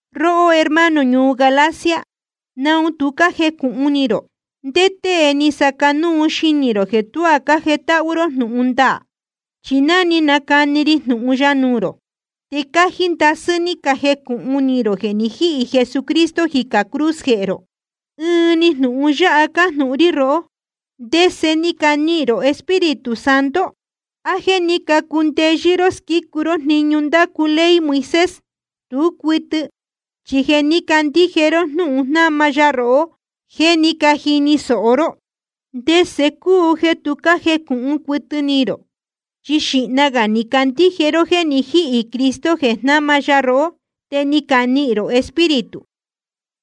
Róhó hermano ñuu Galacia, ¿naun tu cájecūhun ni rō? ¿Ndé tée ni saca núu xinī rō jeē tuá cájetáhú ró jnūhun ndaā? Chi ná ni canacani ri jnūhun ya nuū rō, te cájí ndasɨ́ ni cajecūhun ni rō jeē ni jíhī Jesucristo jicā cruz jehē rō. Ɨɨn‑ni jnūhun yáha cájnūhun rí rohó: ¿Ndese ni canihīn rō Espíritu Santo? ¿A jéē ní cacundeyɨ́ ró squícu ró jniñu ndácu ley Moisés? Tú cuɨtɨ, chi jeē ní cacandíje ró jnúhun jnáma ya rohó jéē ní cajini sōho ró. ¿Ndese cúu jeē tu cájecūhun cuɨtɨ ni rō? Chi xīhna gā ni cacandíje ró jéē ni jíhī Cristo jeē jnama ya rohó, te ni canihīn rō Espíritu.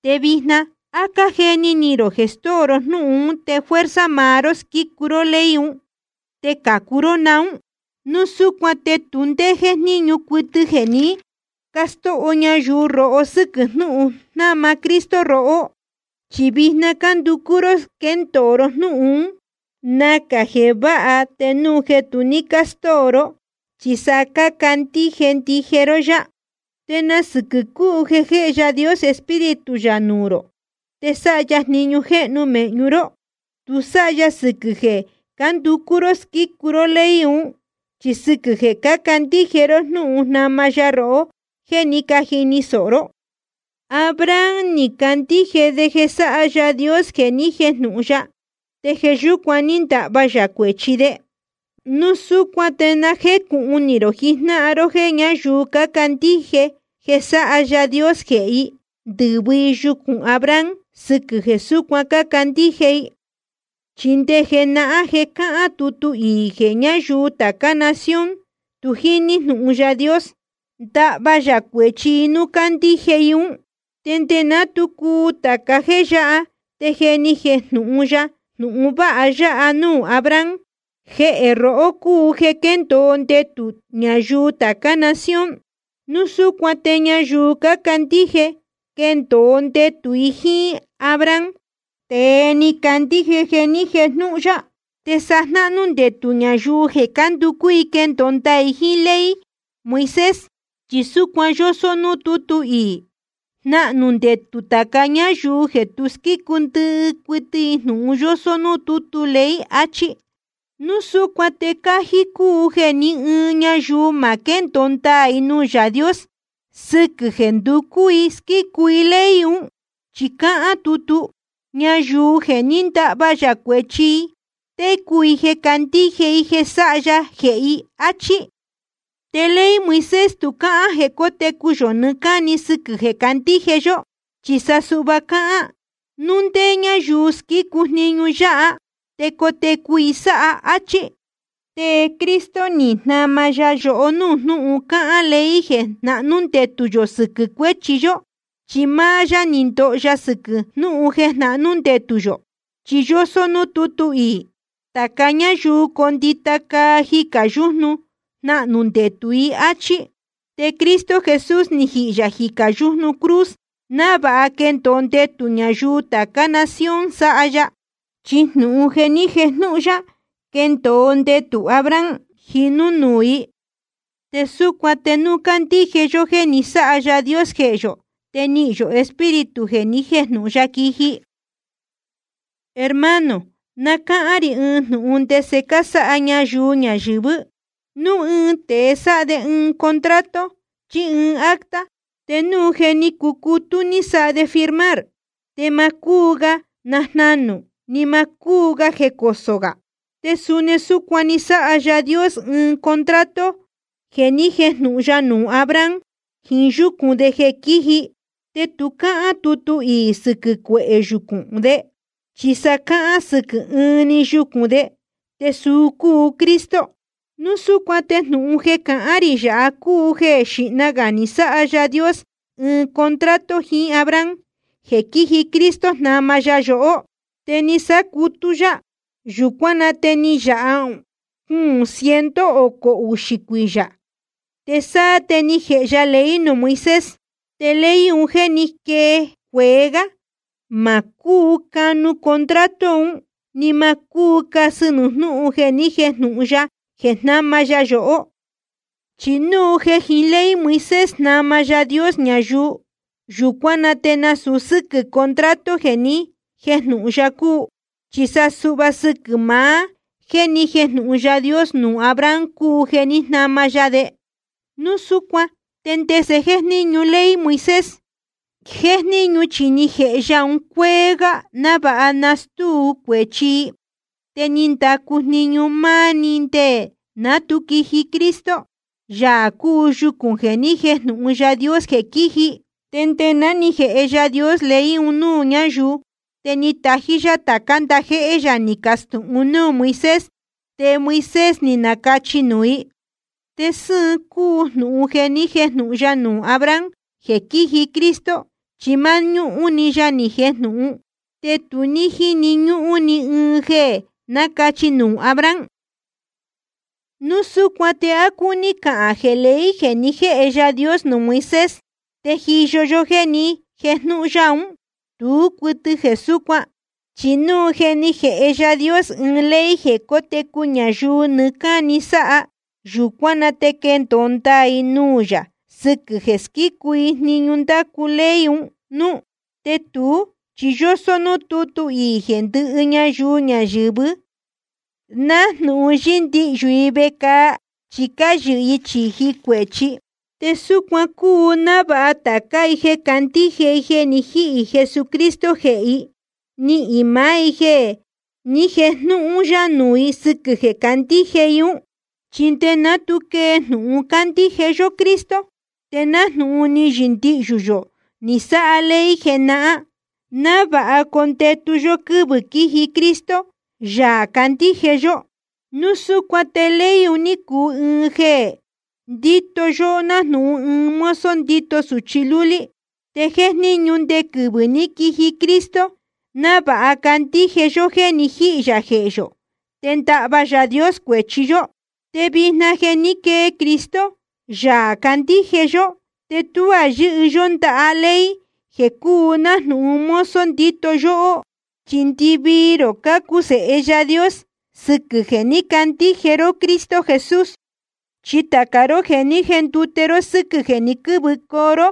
Te vijna ¿á cájeni ni rō jeē stóo ró jnúhun ún te fuerza maá ró squícu ró ley un, te cācu ró naún? Núu súcuan te tu ndé ní jéjníñu cuɨtɨ jeē ní castóho ñayuu rohó sɨ́quɨ̄ jnúhun jnáma Cristo rohó, chi vijna cánducú ró squéndōo ró jnúhun ún. Nacā jeē váha te núu jeē tu ní castóo ró, chi sa cácandíje ndije ró yá. ¿Te na sɨquɨ̄ cúu jeē jéhe Yaā Dios Espíritu yā nuū rō te sáha ya jniñu jéhnu mēhñu ró? Tu sáha ya sɨquɨ̄ jeē cánducú ró squícu ró ley un, chi sɨquɨ̄ jeē ní cacandíje ró jnúhun jnáma ya rohó jéē ní cajini sōho ró. Abraham ni candíje de jeē sáha Yaā Dios jeē ni jéjnūhun ya, te jeē yúcuan ní ndahva yā cuēchi de. Núu súcuan te na jécūhun ni rō jijnáhan ró jéē ñáyuu cácandíje jeē sáha Yaā Dios jehē i, ndɨ́vɨ i yucūn Abraham sɨquɨ̄ jeē súcuan cácandíje i. Chi nde jenahán je cáhán tutu iī jeē ñáyuu tācá nación tu jíní jnūhun Yaā Dios, ndahva yā cuēchi i núu candíje i ún. Te nde ná tu cuu tāca jéē yáha te je ni jejnūhun ya jnūhun vāha yáha nuū Abraham: Jeē rohó cúu jeē quendōo ndetū ñayuu tācá nación. Núu súcuan te ñayuu cácandíje, quéndōo ndetū i jíín Abraham, tēe ni candíje jeē ni jéjnūhun ya. Te sa jnahnū ndetū ñayuu jeē cánducú i quendōo ndaā i jeē jiín ley Moisés. Chi súcuan yósó núū tútu iī: Jnahnū ndetū tāca ñáyuu jeē tu squícu ndɨhɨ cuɨtɨ jnūhun yósó núū tútu ley, achí. Núu súcuan te cájí cúu jeē ni ɨɨn ñayuu ma quéndōo ndaā i nuū Yaā Dios sɨquɨ̄ jeē nducú i squícu i ley un. Chi cáhán tutu: Ñayuu jeē ní ndahva yā cuēchi i, técu i jeē candíje i jeē sáha ya jehē i, áchí. Te ley Moisés tu cáhán jeē cótecu yō nɨɨ́ cáni sɨquɨ̄ jeē candíje yó, chi sa suhva cáhán: Núu ndé ñáyuu squícu jniñu yáha, te cotecu i sáha, áchí. Te Cristo ni jnama ya yohó núū jnúhun cáhán ley jeē jnahnú ndetū yō sɨquɨ̄ cuéchi yó, chi máá yá ni ndoho sɨquɨ̄ jnúhun jeē jnahnú ndetū yō. Chi yósó núū tutu iī: Tāca ñáyuu condita caa jicā yújnu, jnahnū ndetū i, áchí. Te Cristo Jesús ni jihī yā jicā yújnu cruz návāha quendōo ndetū ñayuu tācá nación sáha ya. Chi jnūhun jeē ni jéjnūhun ya quendōo ndetū Abraham, jinū nuū i. Te súcuan te núu candíje yó jeē ni sáha Yaā Dios jehē yō, te nihīn yō Espíritu jeē ni jéjnūhun ya quiji. Hermano, na cáhán rī ɨɨn jnūhun ndese cásáha ñayuu ñayɨ̄vɨ́: Núu ɨɨn tēe sáha de ɨɨn contrato chí ɨɨn acta, te núu je ni cucutú ni sáha de firmar, te ma cúu ga najnanū, ni ma cúu jecosō gā. Te suni súcuan ni sáha Yaā Dios ɨɨn contrato jeē ni jéjnūhun ya nuū Abraham jiín yúcūn de jeē quíji. Te tu cáhán tutu iī sɨquɨ̄ cuehē yucūn de, chi sa cáhán sɨquɨ̄ ɨɨn‑ni yucūn de, te suu cúu Cristo. Núu súcuan te jnūhun jeē cahán rī yāha cúu jeē xīhna gā ni sáha Yaā Dios ɨɨn contrato jiín Abraham, jeē quiji Cristo jnama ya yohó, te ni sácutú yá. Yūcuán na te ni yāha cuūn ciento ocō uxī cuiyā, te sáá te ni jēhe ya ley nuū Moisés. Te ley un jéē ní quee cueé gá, ma cúu nacanu contrato un, ni ma cúu casɨ nuū jnúhun jeē ni jéjnūhun ya jeē jnama ya yohó. Chi núu jeē jiín ley Moisés jnama Yaā Dios ñayuu, yūcuán na te nasūu sɨ́quɨ̄ contrato jeē ni jéjnūhun ya cúu. Chi sa suhva sɨquɨ̄ maá jéē ni jéjnūhun Yaā Dios nuū Abraham cúu jeē ní jnama ya de. Núu súcuan ¿te ndese jéjníñu ley Moisés? Jéjníñu chi ni jēhe ya un cuéé gá návāha nastúu cuēchi i. Te ni ndacu jniñu máá‑ni nde ná tu quiji Cristo, Yaā cúu yucūn jeē ni jéjnūhun Yaā Dios jeē quíji. Te nde ná ni jēhe Yaā Dios ley un núū ñayuu, te ni tají yá tācá ndajéhé yā ni cacastūhun núū Moisés, te Moisés ni nacachī nuū i. Te sɨ́ɨn cúu jnūhun jeē ni jéjnūhun ya nuū Abraham jeē quíji Cristo, chi máñúhún‑ni ya ni jejnūhun, te tu ní jíni ñúhún ni ɨɨn jeē nacachī nuū Abraham. Núu súcuan ¿te á cúní cahān jeē ley jeē ni jéhe Yaā Dios nuū Moisés, téjiyo jeē ni jéjnūhun ya ún? Tú cuɨtɨ jeē súcuan. Chi núu jeē ni jéhe Yaā Dios ɨɨn ley jeē cótecu ñayuu nɨɨ́ cáni sáha, yūcuán na te quendōo ndaā i nuū yā sɨquɨ̄ jeē squícu i jniñu ndácu ley un núú. Te tuú chi yósó núū tútu iī jeē ndɨhɨ ñayuu ñayɨ̄vɨ́, nájnūhun yɨ́ndihyū i vecāa chi cáyɨhɨ i chīji cuēchi. Te súcuan cúu návāha tācá i jeē candíje i jeē ni jíhī Jesucristo jehē i, nihīn i máá jéē ni jéjnūhun ya nuū i sɨquɨ̄ jeē candíje i ún. Chi nde ná tu quee jnūhun candíje yó Cristo, te nájnūhun ni yɨndihyū yō ni sáha ley jenahán, návāha condetu yó quɨ́vɨ̄ quiji Cristo, Yaā candíje yó. Núu súcuan te ley ni cuu ɨɨn jeē ndíto yóhó nájnūhun ɨɨn mozo ndíto sūchi lúlí, te ni jejníñu nde quɨvɨ̄ ní quiji Cristo, návāha candíje yó jéē ni jíhī yā jehē yō, te ndahva Yaā Dios cuēchi yó. Te vijna jeē ní quee Cristo, Yaā candíje yó, te tuá yɨ́hɨ yó ndaha ley jeē cúu nájnūhun mozo ndíto yóhó. Chi ndɨvii rō cácuu sēhe Yaā Dios sɨquɨ̄ jeē ní cacandíje ró Cristo Jesús. Chi tāca ró jeē ní jendute ró sɨ́quɨ̄ jeē ni quɨ́vɨ ró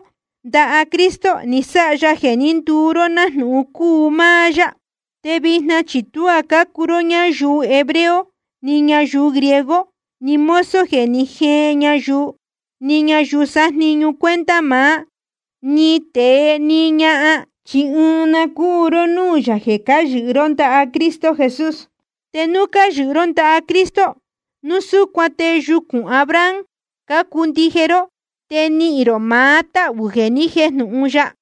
ndaha Cristo, ni sáha ya jeē ní nduu ró nájnūhun cúu máá yá. Te vijna chi tuá cúu ró ni ñayuu hebreo ni ñayuu griego, ni mozo jeē ní jeen ñayuu, ni ñayuu sájniñu cuenta maá, ni tēe ni ñahan. Chi ɨɨn na cúu ró núū yā jeē cáyɨhɨ ró ndaha Cristo Jesús. Te núu cáyɨhɨ ró ndaha Cristo, núu súcuan te yucūn Abraham cácuu ndije ró, te nihīn rō maá táhū jeē ni jéjnūhun ya.